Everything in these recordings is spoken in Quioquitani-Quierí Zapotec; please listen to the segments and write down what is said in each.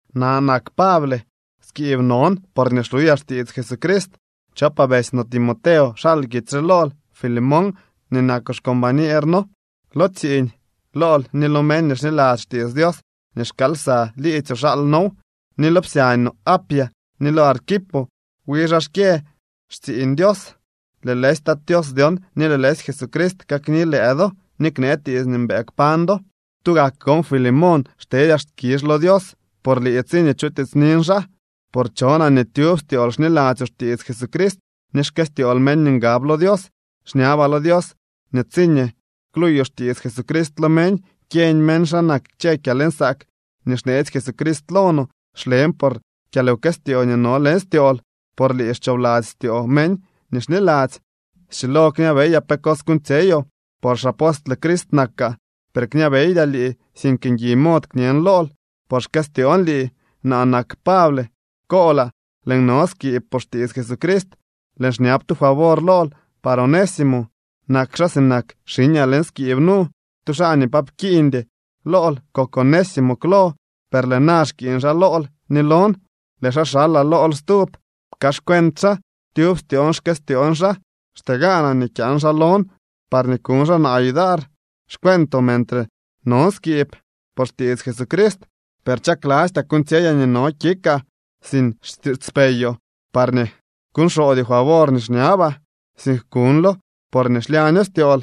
Naa nak Pable, skiib non porñee xluyaa xtiits Jesucrist. Chopaa betsy no Timoteo xal kitsy re lool Filemón nii nakoo xcombañer noo lo tsiiñ. Lool ni lo meñ nii xniladzy xtiits Dios nii xkaal lsa liidzyoo xal noow, ni lo psyañ no Apia ni lo Arquipo. Wi xaa xkyë tsiiñ Dios. Lëë lëësy Tat Tios dyon ni lëë lëësy Jesucrist kakni lëë do ni knee tiits nii mbëë kpañ do. Tugak gon Filemón xtedyaa skizh lo Dios por lii tsiñee chutiitsnin xaa, por chonaa nii tyub styool xniladzyoo xtiits Jesucrist ni xkëstyool meñ nii ngab lo Dios. Xñabaa lo Dios nii tsiñee kluuyoo xtiits Jesucrist lo meñ, kyeñ meñ xa nak kchë kyalnsaak nii xneetsy Jesucrist lo no. Xlen por kyalwkëstyoo nii no leñ styool, por lii xchoobladzy styoo meñ nii xniladzy. Schilo kñabeyaa pe cos kuuñtsyeyoo, por xapostle Crist nakaa. Per kñabeydyaa lii, sink ngui mod kñen lool, por xkëstyoon lii. Naa nak Pable, koolaa. Lëën no skiib por xtiits Jesucrist. Lëën xñab tu favor lool par Onésimo. Nak xaa sinak xiñaa leñ skiib nu. Tu xaa nii pa pkiiñdy lool kok Onésimo klo, per lëë na xkiiñ xaa lool ni lon. Lëë xaa xalaa lool stub. Pkaaxcuent xaa. Tyub styoon xkëstyoon xaa. Xtee gaanaa nii kyaan xaa lon parñee kuñ xaa naa yudar xcuentoo mentre non skiib por xtiits Jesucrist. Per chaklastyaa kuuñtsyeyaa nii no kikaa sin xtiitspeyoo parñee kuñxoodyoo favor nii xñabaa, sink kuñlo porñee xlyaño styool.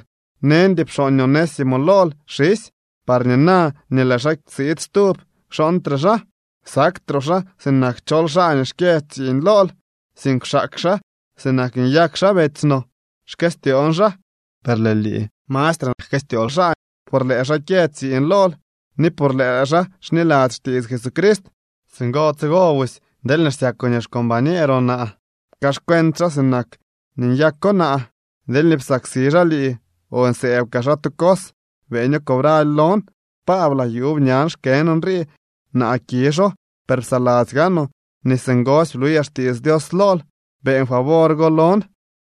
Neñdy pxooñ Onésimo lool xisy parñee na nii lëë xaa siid stub, kxooñtre xaa. Saktroo xaa sinak chol xaa nii xkyë tsiiñ lool, sink kwxaak xaa sinak nii nyak xaa betsy no. Xkëstyoon xaa, per lëë lii mastre jkëstyool xaa, por lëë xaa kyë tsiiñ lool ni por lëë xaa xniladzy xtiits Jesucrist. Singo tsigo busy deelñee xsyakoo nii xcombañeeroo naa, pkaaxcuent xaa sinak nii nyako naa. Deelñee psaksi xaa lii o nsëëb kaa xaa tu cos, beeño cobraly lon. Paablaa, yuub ñan xkën nrii. Naa kizho, per psaladzy gaanoo nii singosy bluyaa xtiits Dios lool. Beeñ favor go lon,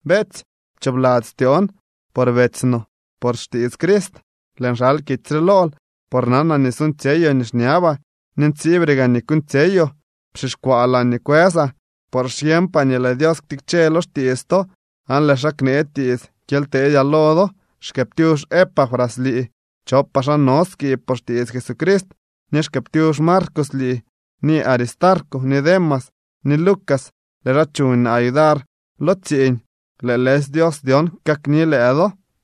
beetsy. Pchoobladzy styoon, por betsy no por xtiits Crist. Lëën xal kitsy re lool por nanaa nii suuñtsyeyoo nii xñabaa ni ntsiibre gaa nii kuuñtsyeyoo. Pxixkwaa laañee kwësaa, por xyeeñpaa nii lëë Dios ktikche lo xtiits to aan lëë xaa knee tiits kyely teedyaa lo do. Xkëëptyux Epafras lii. Chopaa xaa no skiib por xtiits Jesucrist. Ni xkëëptyux Marcos lii, ni Aristarco, ni Demas ni Lucas. Lëë xaa chuñ naa yudar lo tsiiñ. Lëë lëësy Dios dyon kakni lëë do.